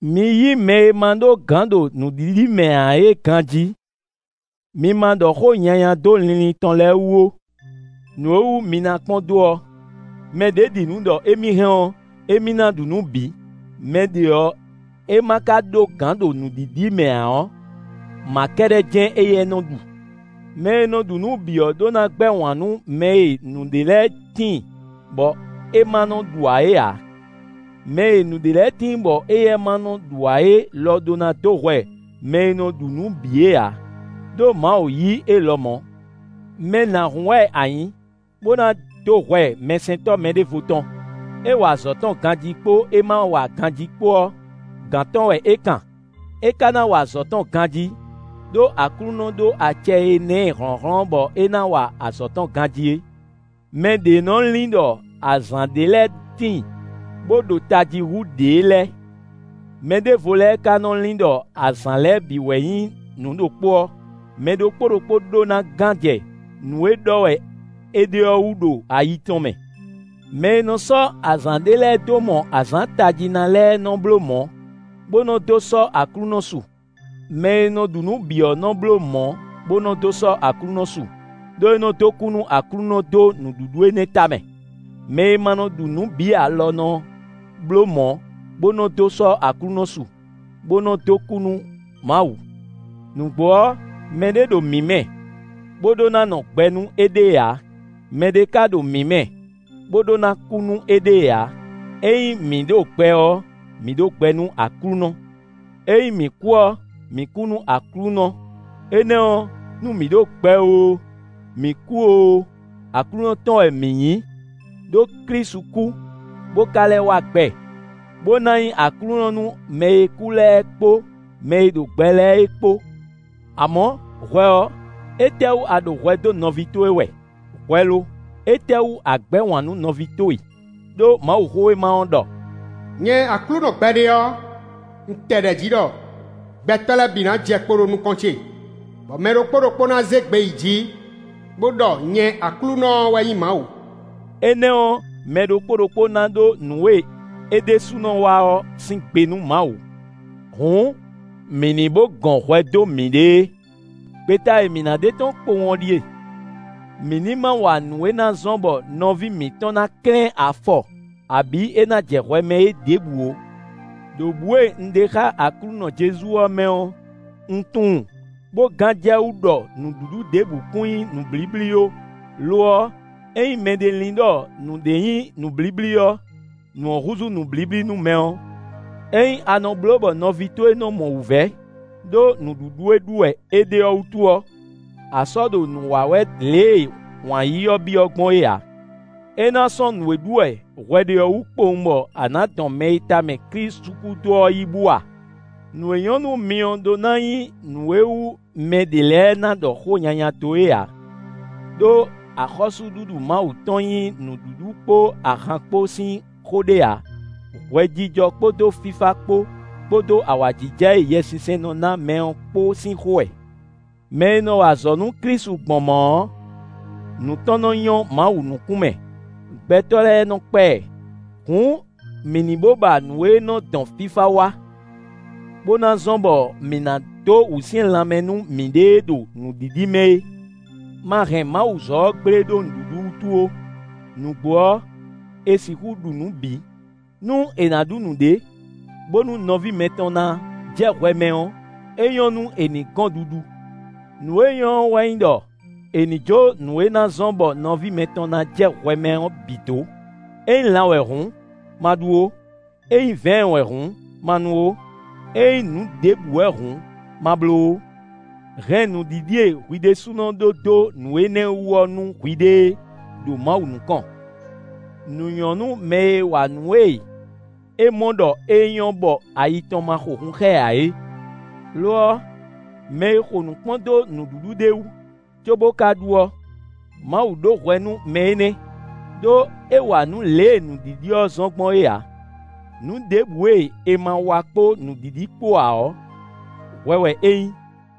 Mi yí mɛ e ma ɖó gǎn ɖo nǔɖiɖi mɛ ǎ é ganjí, mi ma ɖɔ xó nyanya dó linlin tɔn lɛ́ɛ wú ó. Nǔ e wú mi na kpɔ́n dó ɔ́, mɛ ɖě ɖi nǔ ɖɔ émí hɛn ɔ́, émí ná ɖu nǔ bǐ; mɛ ɖe ɔ́ e ma ka ɖó gǎn ɖo nǔɖiɖi mɛ ǎ ɔ́, mǎ kɛ́ɖɛ́ jɛ́n éyɛ́ nɔ ɖu. Mɛ e nɔ ɖu nǔ bǐ ɔ́ ɖó ná gbɛ́ wǎn nú mɛ e nǔɖé lɛ́ɛ tíin, bɔ é ma nɔ ɖu ǎ é ǎ; mɛ e nǔɖé lɛ́ɛ tíin bɔ éyɛ́ ma nɔ ɖu ǎ é lɔ ɖó ná dó hwɛ mɛ e nɔ ɖu nǔ bǐ é ǎ; ɖó Mawu yí é lɔmɔ̌. Mɛ nǎhún wɛ a nyǐ, bó ná dó hwɛ mɛsɛntɔ́ mɛɖěvo tɔn? É wa azɔ̌ tɔn ganjí kpó é ma wa ganjí kpó ɔ́, gǎn tɔn wɛ é kan. É ka ná wa azɔ̌ tɔn ganjí, ɖó Aklúnɔ ɖó acɛ e ná ɛ hlɔ̌nhlɔ́n bɔ é ná wa azɔ̌ tɔn ganjí é. Mɛ ɖě nɔ lin ɖɔ azǎn ɖé lɛ́ɛ tíin, bó ɖo tají hú ɖě lɛ́ɛ; mɛ ɖěvo lɛ́ɛ ka nɔ lin ɖɔ azǎn lɛ́ɛ bǐ wɛ nyí nǔ ɖokpó ɔ́. Mɛ ɖokpó ɖokpó ɖó ná gán jɛ nǔ e ɖɔ wɛ é ɖe ɔ́ wú ɖo ayi tɔn mɛ. Mɛ e nɔ sɔ́ azǎn ɖé lɛ́ɛ dó mɔ azǎn tají ná lɛ́ɛ nɔ́ bló mɔ̌, bó nɔ dó sɔ́ Aklúnɔ su; mɛ e nɔ ɖu nǔ bǐ ɔ́, nɔ bló mɔ̌, bó nɔ dó sɔ́ Aklúnɔ su; ɖó é nɔ dó kú nú Aklúnɔ dó nǔɖuɖu énɛ́ tamɛ. Mɛ e ma nɔ ɖu nǔ bǐ ǎ lɔ nɔ bló mɔ̌, bó nɔ dó sɔ́ Aklúnɔ su, bó nɔ dó kú nú Mawu. Nǔgbó ɔ́, mɛɖé ɖo mǐ mɛ, bó ɖó ná nɔ gbɛ nú éɖée ǎ; mɛɖé ka ɖo mǐ mɛ, bó ɖó ná kú nú éɖée ǎ. Ényí mǐ ɖo gbɛ ɔ́, mǐ ɖo gbɛ nú Aklúnɔ. Ényí mǐ kú ɔ́, mǐ kú nú Aklúnɔ. Énɛ́ ɔ́, nú mǐ ɖo gbɛ oo, mǐ kú oo, Aklúnɔ tɔn wɛ mǐ nyǐ. Đó Klísu kú, bó ka lɛ́ wá gbɛ, bó ná nyí Aklúnɔ nú mɛ e kú lɛ́ɛ kpó mɛ e ɖo gbɛ lɛ́ɛ é kpó. Amɔ̌, hwɛ ɔ́, étɛ́wú a ɖo hwɛ dó nɔví towe wɛ? Hwɛ lo, étɛ́wú a gbɛ̌ wǎn nú nɔví towe? Đó Mawuxówéma ɔ́ ɖɔ: “Nyɛ Aklúnɔ gbɛɖe ɔ́, un tɛ ɖɛ̌ jí ɖɔ: gbɛtɔ́ lɛ́ɛ bǐ ná jɛ kpo ɖo nukɔn ce, bɔ mɛ ɖokpó ɖokpó ná zé gbe yi jǐ, bó ɖɔ nyɛ Aklúnɔ ɔ́ wɛ nyí Mawu.” Énɛ́ ɔ́, mɛ ɖokpó ɖokpó ná ɖó nǔ e é ɖésúnɔ wa ɔ́ sín gbe nú Mawu. Hǔn, mǐ ní bó gɔn hwɛ dó mǐɖée. Gbeta e mǐ ná ɖe tɔ́n kpowun ɔ́ ɖíe: Mǐ ní ma wa nǔ e ná zɔ́n bɔ nɔví mǐtɔn ná klɛ́n afɔ, abǐ é ná jɛ hwɛ mɛ é ɖěbǔ ó. Đo bǔ e un ɖe xá Aklúnɔ Jezu ɔ́ mɛ ɔ́, un tunwun, bó gán jɛ wú ɖɔ nǔɖuɖu ɖěbǔ kún nyí nǔblíblí ó; lo ɔ́, ényí mɛɖé lin ɖɔ nǔɖé nyí nǔblíblí ɔ́, nǔ ɔ́ húzú nǔblíblí nú mɛ ɔ́. Ényí a nɔ bló bɔ nɔví towe nɔ mɔ wǔvɛ́ ɖó nǔɖuɖu e ɖu wɛ a ɖe ɔ́ wútu ɔ́, a sɔ́ ɖo nǔ wa wɛ lě e wǎn yíyí ɔ́ byɔ́ gbɔn é ǎ. É ná sɔ́n nǔ e ɖu wɛ hwɛ ɖe ɔ́ wú kpowun bɔ a nǎ dɔn mɛ e tamɛ Klísu kú dó ɔ́ yí bú a? Nǔ e nyɔ́ nú mi ɔ́ ɖó ná nyí nǔ e wú mɛ ɖě lɛ́ɛ ná ɖɔ xó nyanya dó é ǎ. Đó axɔ́súɖuɖu Mawu tɔn nyí nǔɖuɖu kpó ahan kpó sín xó ɖé ǎ; hwɛjijɔ kpódó fífá kpó, kpódó awǎjijɛ e Yɛsinsɛn nɔ ná mɛ ɔ́ kpó sín xó wɛ. Mɛ e nɔ wa azɔ̌ nú Klísu gbɔn mɔ̌ ɔ́, nǔ tɔn nɔ nyɔ́ Mawu nukún mɛ; gbɛtɔ́ lɛ́ɛ nɔ kpa ɛ. Hǔn, mǐ ní bó ba nǔ e nɔ dɔn fífá wá, bó ná zɔ́n bɔ mǐ ná dó wǔsyɛ́n lanmɛ nú miɖée ɖo nǔɖiɖi mɛ é. Ma hɛn Mawuzɔ́ ɔ́ gblé ɖó nǔɖuɖu wútu ó. Nǔgbó ɔ́, è sixú ɖu nǔ bǐ. Nú è nǎ ɖu nǔɖé, bónú nɔví mɛtɔn ná jɛ hwɛ mɛ ɔ́, é nyɔ́ nú è nǐ gɔn ɖuɖu. Nǔ e nyɔ́ ɔ́ wɛ nyí ɖɔ, è nǐ jó nǔ e ná zɔ́n bɔ nɔví mɛtɔn ná jɛ hwɛ mɛ ɔ́ bǐ dó; ényí lan wɛ hǔn, ma ɖu ó; ényí vɛ̌ɛn wɛ hǔn, ma nu ó; ényí nǔ ɖěbǔ wɛ hǔn, ma bló ó. Hɛn nǔɖiɖi e hwi ɖésúnɔ ɖó dó nǔ énɛ́ wú ɔ́ nú hwiɖée ɖo Mawu nukɔn. Nǔ nyɔ́ nú mɛ e wa nǔ e é mɔ ɖɔ é nyɔ́ bɔ ayi tɔn ma xo hun xá ɛ ǎ é. Lo ɔ́, mɛ e xo nǔ kpɔ́n dó nǔɖuɖu ɖé wú, cóbó ka ɖu ɔ́, Mawu ɖó hwɛ nú mɛ énɛ́; ɖó é wa nǔ lě e nǔɖiɖi ɔ́ zɔ́n gbɔn é ǎ. Nǔ ɖěbǔ e è ma wa kpó nǔɖiɖi kpó ǎ ɔ́, hwɛ wɛ é nyí.